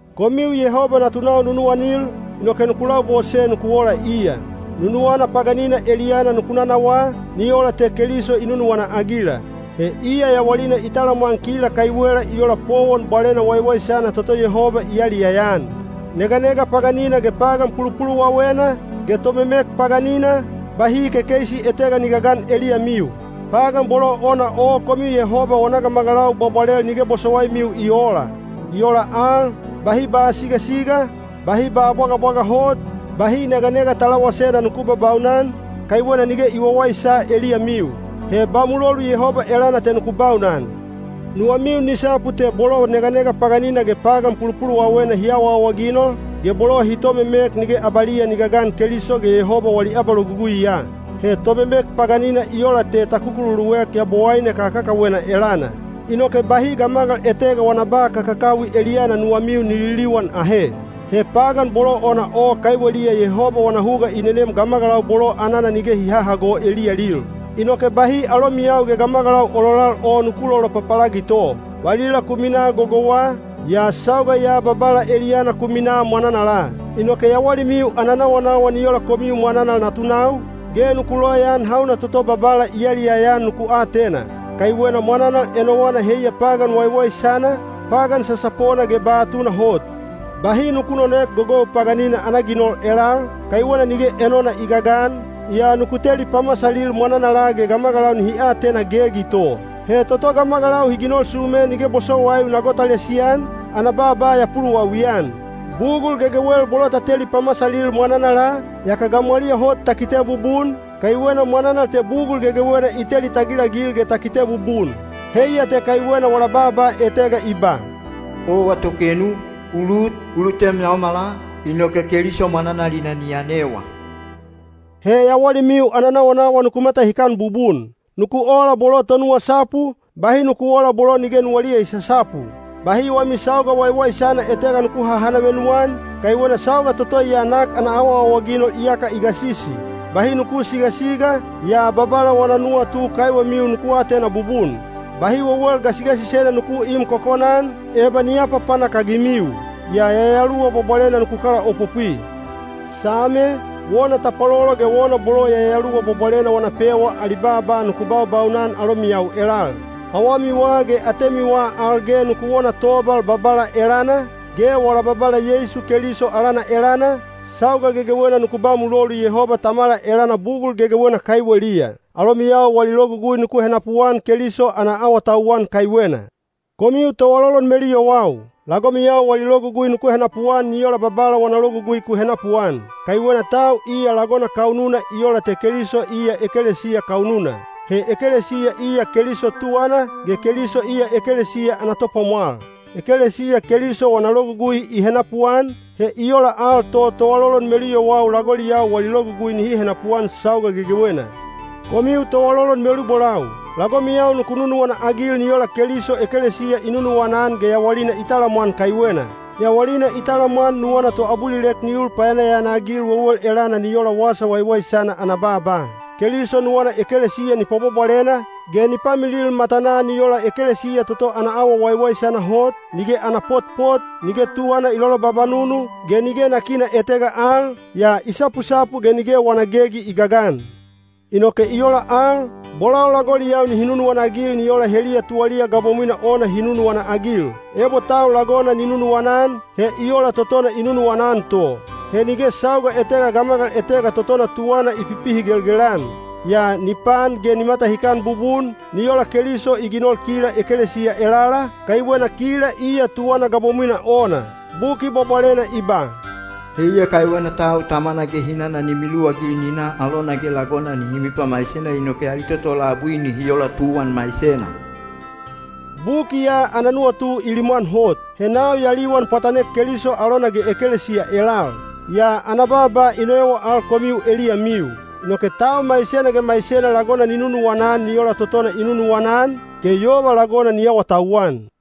Komiu Yehoba natunau nunuwanil, inoke nuku labose nuku ola iya. Nunuwana paganina eliyana nuku nanawaa, ni ola te Keliso i nunuwana-agila. He iya yawalina i talamwan kila kaiwela i ola powon bwalena waiwaisana toto Yehoba i yaliyaya-an. Neganega paganina ge pagan pulupuluwawena, ge tomemek paganina, bahi kekeisi etega ni gagan eliyamiu. Pagan bolo ona o komiu Yehoba wana gamagalau bwabwalel nige bosowaimiu i oola. I ola al, bahi ba sigasiga, bahi ba bwagabwaga hot, bahi neganega talawasena nuku babaunan, kaiwena nige i wawaisa eliyamiu. He ba mulolu Yehoba elana te nuku baunan. Nuwamiu ni sapu te bolo neganega paganina ge pagan pulupuluwawena hi awaawaginol, ge bolo hi tomemek nige abaliya ni gagan Keliso ge Yehoba wali abaloguguiya. (He tomemek paganina i ola te ta kukululuek yabowaine kakakawena elana.) Inoke bahi gamagal etega wana ba kakakawi eliyana nuwamiu ni liliwan ahe. He pagan bolo ona o kaiweliya Yehoba wana huga i nenem gamagalau bolo anana nige hi hahago eliyalil. Inoke bahi alomiyau ge gamagalau ololal o nuku lolopapalagito. Valila ku minaa gogouwa, yaa sauga ya Babala eliyana ku minaa mwananala. Inoke yawalimiu ana nawanawa ni ola komiu mwananal natunau, ge nuku loyaan hauna toto Babala i yaliyaya-an nuku atena. Kaiwena mwananal enowana heiya pagan waiwaisana, pagan sasapona ge ba tunahot. Bahi nuku nonoek gogou paganina ana ginol elal, kaiwena nige enona i gagan, yaa nuku teli pamasalil mwananala ge gamagalau nihi atena gegi to. (He toto gamagalau hi ginol sume nige bosowaiu na gotalisi-an, ana baaba ya puluwawi-an.) Bugul gegewel bolo ta teli pamasalil mwananala, yaka gamwaliya hot ta kite bubun, kaiwena mwananal te bugul gegewena i teli tagilagil ge ta kite bubun. Heiya te kaiwena wala baaba etega i ba: Owa tokenu, u lut, u lutem yaomala, inoke Keliso mwananalina ni yanewa. He yawalimiu ana nawanawa nuku matahikan bubun. Nuku ola bolo tonuwasapu, bahi nuku oola bolo nige nuwaliya i sasapu. Bahi wami sauga waiwaisana etega nuku hahanavenu-an, kaiwena sauga toto ya nak ana awaawaginol iyaka i gasisi. Bahi nuku sigasiga, yaa Babala wana nuwatu kaiwemiu nuku atena bubun. Bahi wewel gasigasisena nuku im kokona-an, eba ni apapanak-agimiu. Yaa Yayaluwa Bwabwalena nuku kalaopopwi. Same, wona tapwalolo ge wona bolo Yayaluwa Bwabwalena wana pewa ali baaba nuku baubaunan alomiyau elal. Awamiwa ge atemiwa al ge nuku wona tobal Babala elana, ge wala Babala Yeisu Keliso alana elana, sauga gegewena nuku ba mulolu Yehoba Tamala elana bugul gegewena kaiweliya. Alomiyau wali logugui nuku henapuan Keliso ana awatauwan kaiwena. Komiu toalolon meluyowau, lagomiyau wali logugui nuku henapuan ni ola Babala wana logugui ku henapuan. Kaiwena tau iya lagona kaununa i ola te Keliso iya ekelesiya kaununa. He ekelesiya iya Keliso tuwana, ge Keliso iya ekelesiya ana Topwamwal. Ekelesiya Keliso wana logugui i henapuan, he i ola al to toalolon meluyowau lagoliyau wali logugui nihi henapuan sauga gegewena. Komiu toalolon melubolau, lagomiyau nuku nunuwana-agil ni ola Keliso ekelesiya i nunuwana-an ge yawalina i talamwan kaiwena. Yawalina i talamwan nuwana toabulilek ni ul payanayana-agil wewel elana ni ola Wasa Waiwaisana ana baaba. Keliso nuwana ekelesiya ni pwabwabwalena, ge ni pamilil matanaa ni ola ekelesiya toto ana awa waiwaisana hot, nige ana potpot, nige tuwana i lolobabanunu, ge nige nakina etega al, yaa i sapusapu ge nige wana gegi i gagan. Inoke i ola al, bolau lagoliyau nihi nunuwana-agil ni ola heliya tuwaliya gabomwina ona hi nunuwana-agil. Ebo tau lagona ni nunuwana-an, he i ola totona i nunuwana-an to. He nige sauga etega gamagal etega totona tuwana i pipihigelgel-an. Yaa ni paan ge ni matahikan bubun, ni ola Keliso i ginol kila ekelesiya elala, kaiwena kila iya tuwana gabomwina ona. Buki Bwabwalena i ba, “Heiya kaiwena tau tamana ge hinana ni miluwagil ni na alona ge lagona nihi mipamaisena inoke ali toto labui nihi ola tuwan maisena.” Buki ya ana nuwatu i limwan hot. He nau ya liwan pwatanek Keliso alona ge ekelesiya elal. Yaa ana baaba i noewa al komiu eliyamiu. Inoke tau maisena ge maisena lagona ni nunuwana-an ni ola totona i nunuwana-an, ge yova lagona ni awatauwan.